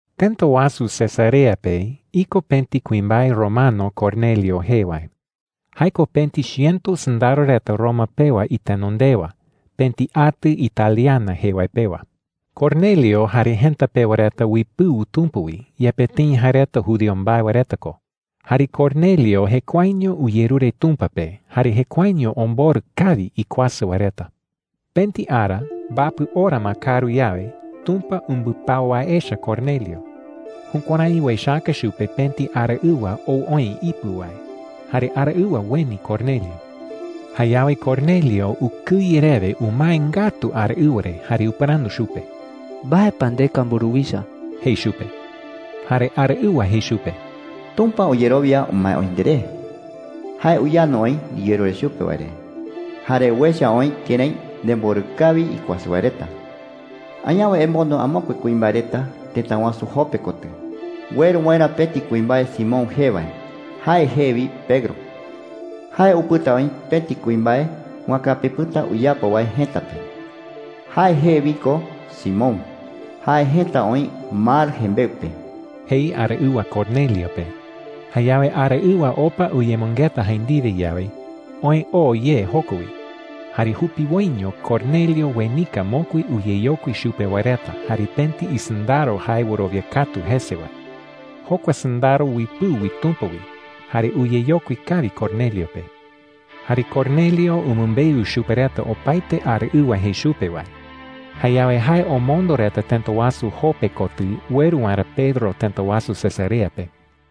Tëta wasu Cesarea pe iko pëti kuimbae romano Cornelio jee wae. Jae ko pëti chiëto sɨndaro reta Roma pewa itenondewa, pëti atɨ Italiana jee wae pewa. Cornelio jare jëta pewa reta uipɨu Tumpa wi, yepe tëi jae reta judío mbae wae reta ko. Jare Cornelio jekuaeño uyerure Tumpa pe, jare jekuaeño omborɨ kawi ikuasɨ wae reta. Pëti ara, mbapɨ ora ma kaaru yawe, Tumpa umbɨpau wae echa Cornelio. Jukuärái uechaka chupe pëti araɨwa ou oï ipɨ wae. Jare araɨwa ueni Cornelio. Jayawe Cornelio ukɨye rewe umae ngatu araɨwa re jare upɨrandu chupe: “¿Mbae pa ndeka, mburuwicha?” jei chupe. Jare araɨwa jei chupe: “Tumpa uyerowia umae oï nderé,” jei. “Jae uyandu oï ndiyerure chupe wae re jare uecha oï kërái nemborɨ kawi ikuasɨ wae reta,” jei. “Añawe emondo amokue kuimbae reta tëta wasu Jope kotɨ ueru waerä pëti kuimbae Simón jee wae. Jae jee wi Pedro,” jei. “Jae upɨta oï pëti kuimbae wakapi pɨ̈ta uyapo wae jëta pe. Jae jee wi ko Simón. Jae jëta oï mar jembeɨ pe,” jei araɨwa Cornelio pe. Jayawe araɨwa opa uyemɨngeta jae ndiwe yawe, oë oo ye joko wi. Jare jupiwoiño Cornelio uenika mokui uyeyokui chupe wae reta jare pëti isɨndaro jae wɨrowia katu jese wae. Jokua sɨndaro uipɨu wi Tumpa wi jare uyeyokui kawi Cornelio pe. Jare Cornelio umɨmbeu chupe reta opaete araɨwa jei chupe wae. Jayawe jae omondo reta tëta wasu Jope kotɨ ueru waerä Pedro tëta wasu Cesarea pe.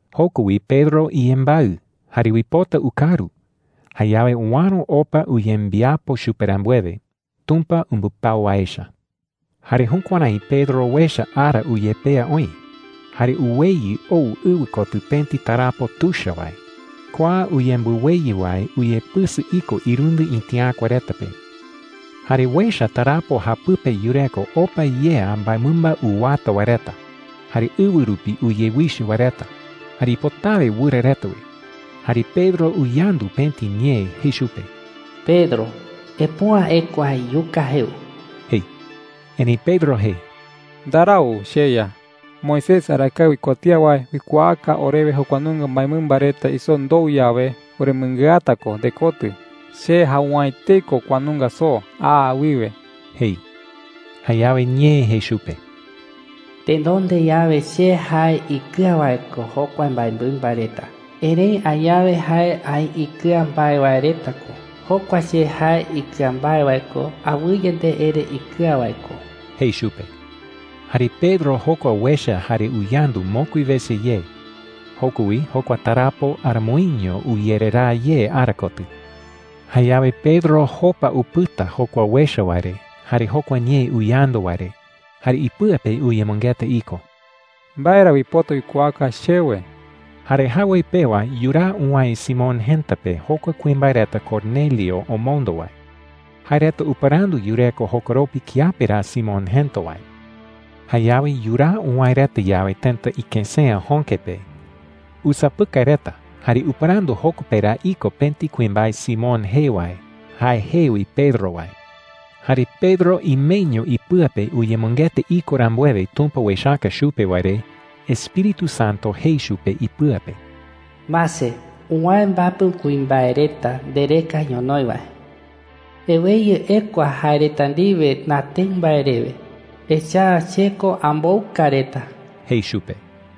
Joko wi Pedro iyembaɨ jare uipota ukaru. Jayawe uäro opa uyembiapo chupe rambuewe, Tumpa umbɨpau wae echa. Jare jukuärái Pedro uecha ara uyepea oï, jare uweyɨ ou ɨwɨ kotɨ pëti tarapo tuicha wae. Kua uyembɨweyɨ wae uyepɨsɨ iko irundɨ itiäkua reta pe. Jare uecha tarapo japɨpe yureko opa yea mbaemɨmba uwata wae reta, jare ɨwɨ rupi uyewichɨ wae reta, jare ipotawe wɨra reta wi. Jare Pedro uyandu pëti ñee jei chupe: “Pedro, epüa ekua iyuka jeu,” jei. Erëi Pedro jei: “Ndarau, cheYa,” jei. “Moisés arakae uikuatía wae uikuaaka orewe jokua nunga mbaemɨmba reta isoo ndou yawe, oremɨngɨata ko ndekotɨ. Che jau’ä etei ko kua nunga soo aa wiwe,” jei. Jayawe ñee jei chupe: “Tenonde yawe che jae ikɨa wae ko jokua mbaemɨmba reta. Erëi añawe jae aï ikɨa mbae wae reta ko. Jokua che jae ikɨa mbae wae ko, awɨye nde ere ikɨa wae ko,” jei chupe. Jare Pedro jokua uecha jare uyandu mokui wese ye. Joko wi jokua tarapo aramoiño uyereraa ye ara kotɨ. Jayawe Pedro jopa upɨta jokua uecha wae re jare jokua ñee uyandu wae re, jare ipɨa pe uyemɨngeta iko: “¿Mbae ra uipota uikuaaka chewe?” Jare jawoi pewa yuraa uwäe Simón jëta pe jokua kuimbae reta Cornelio omondo wae. Jae reta upɨrandu yureko jokoropi kiape ra Simón jëta wae. Jayawe yuraa uwäe reta yawe tëta ikësea jöke pe, usapɨkai reta jare upɨrandu joko pe ra iko pëti kuimbae Simón jee wae, jae jee wi Pedro wae. Jare Pedro imeño ipɨa pe uyemɨngeta iko rambuewe Tumpa uechaka chupe wae re, Espíritu Santo jei chupe ipɨa pe: “Mase, uwäe mbapɨ kuimbae reta ndereka ñonoï wae,” jei. “Eweyɨ ekua jae reta ndiwe natëɨ mbae rewe, echa’ä che ko ambouka reta,” jei chupe.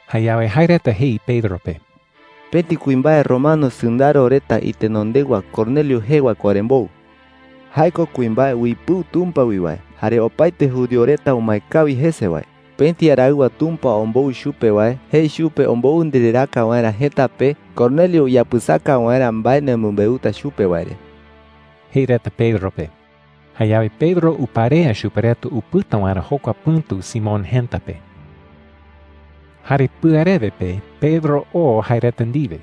Jayawe jae reta jei Pedro pe: “Pëti kuimbae romano sɨndaro reta itenondewa Cornelio jee wae ko orembou,” jei. “Jae ko kuimbae uipɨu Tumpa wi wae jare opaete judío reta umae kawi jese wae. Pëti araɨwa Tumpa ombou chupe wae jei chupe ombou ndereraaka waerä jëta pe, Cornelio uyapɨsaka waerä mbae nemɨmbeuta chupe wae re,” jei reta Pedro pe. Jayawe Pedro uparea chupe reta upɨta waerä jokua pɨ̈tu Simón jëta pe. Jare pɨarewe pe Pedro oo jae reta ndiwe.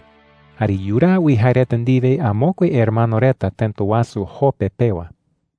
Jare yuraa wi jae reta ndiwe amokue hermano reta tëta wasu Jope pewa.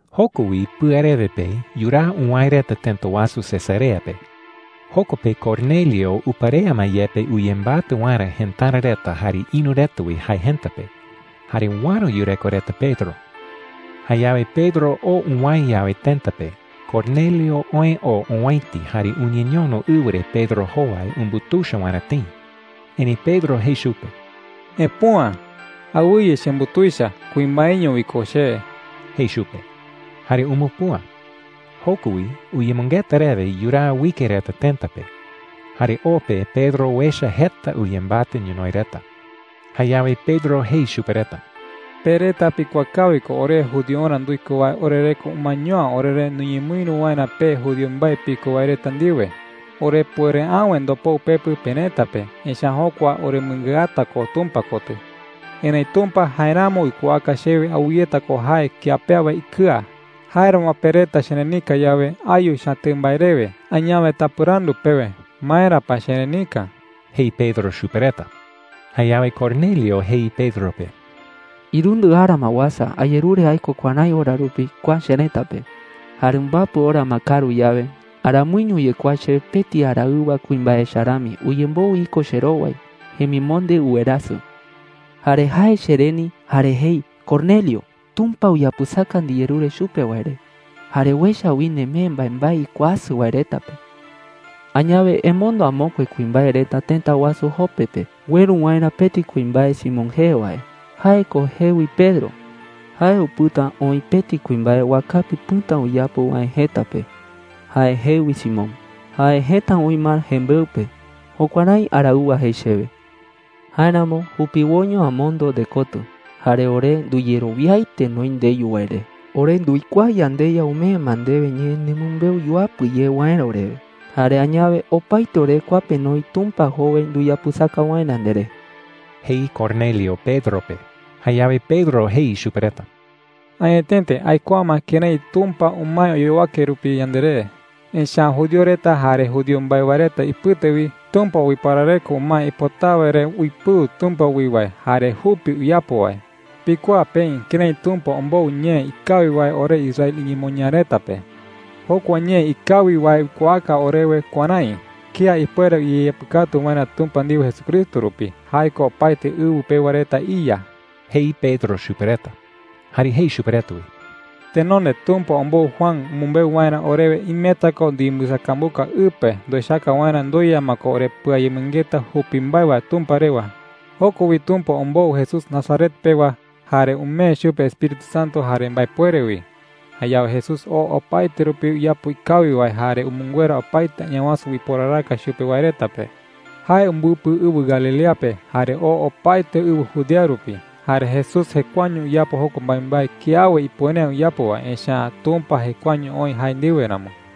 Joko wi pɨarewe pe yuraa uwäe reta tëta wasu Cesarea pe. Joko pe Cornelio uparea ma yepe uyembatɨ waerä jëtara reta jare ïru reta wi jae jëta pe. Jare uäro yureko reta Pedro. Jayawe Pedro oo uwäe yawe tëta pe, Cornelio oë oo owäiti jare uñeñono ɨwɨ re Pedro jowai umbutuicha waerä tëi. Erëi Pedro jei chupe: “Epüa,” jei. “¡Awɨye chembutuicha! ¡Kuimbaeño wi ko che!” jei chupe. Jare umupüa. Joko wi uyemɨngeta rewe yuraa uike reta tëta pe. Jare o pe Pedro uecha jeta uyembatɨ ñonoï reta. Jayawe Pedro jei chupe reta: “Pe reta pikuaa kawi ko ore judiorä nduiko wae orereko umaeño’ä oreré nuñemɨïru waerä pe judío mbae piko wae reta ndiwe. Orepuere’äwe ndopou pepɨ perëta pe, echa’ä jokua oremɨngɨata ko Tumpa kotɨ,” jei. “Erëi Tumpa jaeramo uikuaaka chewe awɨyeta ko jae kía pe awe ikɨa. Jáeramo pe reta cherenika yawe, ayu chatëɨ mbae rewe. Añawe tapɨrandu pewe, ¿maera pa cherenika?” jei Pedro chupe reta. Jayawe Cornelio jei Pedro pe: “Irundɨ ara ma uasa, ayerure aiko kuärái ora rupi kua cherëta pe,” jei. “Jare mbapɨ ora ma kaaru yawe, aramoiño uyekuaa chewe pëti araɨwa kuimbae echa rami uyemboɨ iko cherowai. Jemimonde uwerasɨ,” jei. “Jare jae chereni jare jei: ‘Cornelio, Tumpa uyapɨsaka ndiyerure chupe wae re, jare uecha wi nemee mbaembae ikuasɨ wae reta pe. Añawe emondo amokue kuimbae reta tëta wasu Jope pe ueru waerä pëti kuimbae Simón jee wae. Jae ko jee wi Pedro. Jae upɨta oï pëti kuimbae wakapi pɨ̈ta uyapo wae jëta pe. Jae jee wi Simón. Jae jëta oï mar jembeɨ pe.’ Jukuärái araɨwa jei chewe,” jei. “Jáeramo jupiwoiño amondo ndekotɨ, jare ore nduyerowiaete noï ndeyu wae re. Ore nduikuaa yandeYa umee ma ndewe ñee nemɨmbeu yuapɨ ye waerä orewe. Jare añawe opaete ore kua pe noï Tumpa jowai nduyapɨsaka waerä nderé,” jei Cornelio Pedro pe. Jayawe Pedro jei chupe reta: “Añetete aikuaa ma kërái Tumpa umae oyowake rupi yanderé,” jei. “Echa’ä judío reta jare judío mbae wae reta ipɨte wi, Tumpa uiparareko umae ipotawe re uipɨu Tumpa wi wae jare jupi uyapo wae,” jei. “Pikuaa peï kërái Tumpa ombou ñee ikawi wae ore Israel iñemoñaa reta pe,” jei. “Jokua ñee ikawi wae uikuaaka orewe kuärái: kía ipuere uyeapɨkatu waerä Tumpa ndiwe Jesucristo rupi – jae ko opaete ɨwɨ pewa reta iYa,” jei Pedro chupe reta. Jare jei chupe reta wi: “Tenonde Tumpa ombou Juan umɨmbeu waerä orewe imeta ko nduyembɨsakambuka ɨ pe nduechaka waerä ndueya ma ko orepɨayemɨngeta jupi mbae wae Tumpa rewa,” jei. “Joko wi Tumpa ombou Jesús Nazaret pewa, jare umee chupe Espíritu Santo jare mbaepuere wi. Jayawe Jesús oo opaete rupi uyapo ikawi wae jare umɨnguera opaete Añawasu uiporaraka chupe wae reta,” jei. “Jae umbɨpɨ ɨwɨ Galilea pe jare oo opaete ɨwɨ Judea rupi. Jare Jesús jekuaeño uyapo jokua mbaembae kiawe ipuere’ä uyapo wae, echa’ä Tumpa jekuaeño oï jae ndiwe ramo,” jei.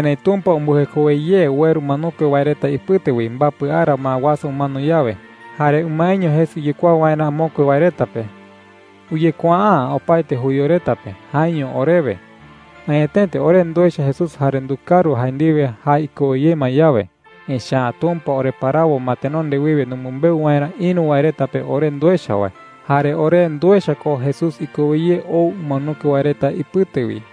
“Erëi Tumpa umbɨjekowe ye ueru umanokue wae reta ipɨte wi mbapɨ ara ma uasa umano yawe. Jare umaeño jese uyekuaa waerä amokue wae reta pe,” jei. “Uyekuaa’ä opaete judío reta pe, jaeño orewe. Añetete ore nduecha Jesús jare ndukaru jae ndiwe jae ikowe ye ma yawe. Echa’ä Tumpa oreparawo ma tenonde wiwe numɨmbeu waerä ïru wae reta pe ore nduecha wae. Jare ore nduecha ko Jesús ikowe ye ou umanokue wae reta ipɨte wi,” jei.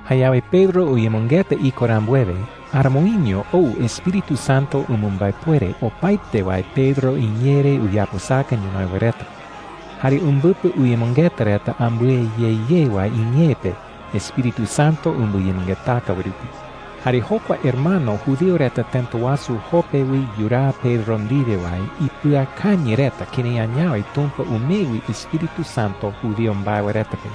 Jayawe Pedro uyemɨngeta iko rambuewe, aramoiño ou Espíritu Santo umɨmbaepuere opaete wae Pedro iñee re uyapɨsaka ñonoï wae reta. Jare umbɨpɨ uyemɨngeta reta ambɨe ye ye wae iñee pe Espíritu Santo umbɨyemɨngetaka wae rupi. Jare jokua hermano judío reta tëta wasu Jope wi yuraa Pedro ndiwe wae ipɨakañɨ reta kërái añawe Tumpa umee wi Espíritu Santo judío mbae wae reta pe.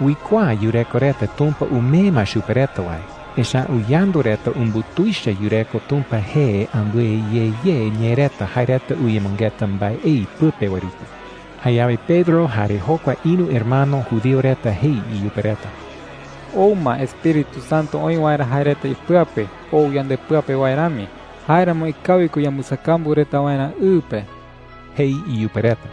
Uikuaa yureko reta Tumpa umee ma chupe reta wae, echa’ä uyandu reta umbutuicha yureko Tumpa jee ambɨe ye ye ñee reta jae reta uyemɨngeta mbaei pɨpe wae rupi. Jayawe Pedro jare jokua ïru hermano judío reta jei iyupe reta: “Ou ma Espíritu Santo oï waerä jae reta ipɨa pe, ou yandepɨa pe wae rami. Jáeramo ikawi ko yambɨsakambu reta waerä ɨ pe,” jei iyupe reta.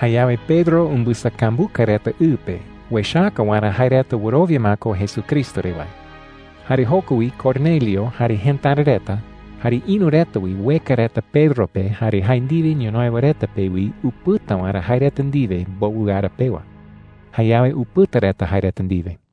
Jayawe Pedro umbɨsakambuka reta ɨ pe uechaka waerä jae reta wɨrowia ma ko Jesucristo re wae. Jare joko wi Cornelio, jare jëtara reta, jare ïru reta wi ueka reta Pedro pe jare jae ndiwe ñonoï wae reta pe wi upɨta waerä jae reta ndiwe mbowɨ ara pewa. Jayawe upɨta reta jae reta ndiwe.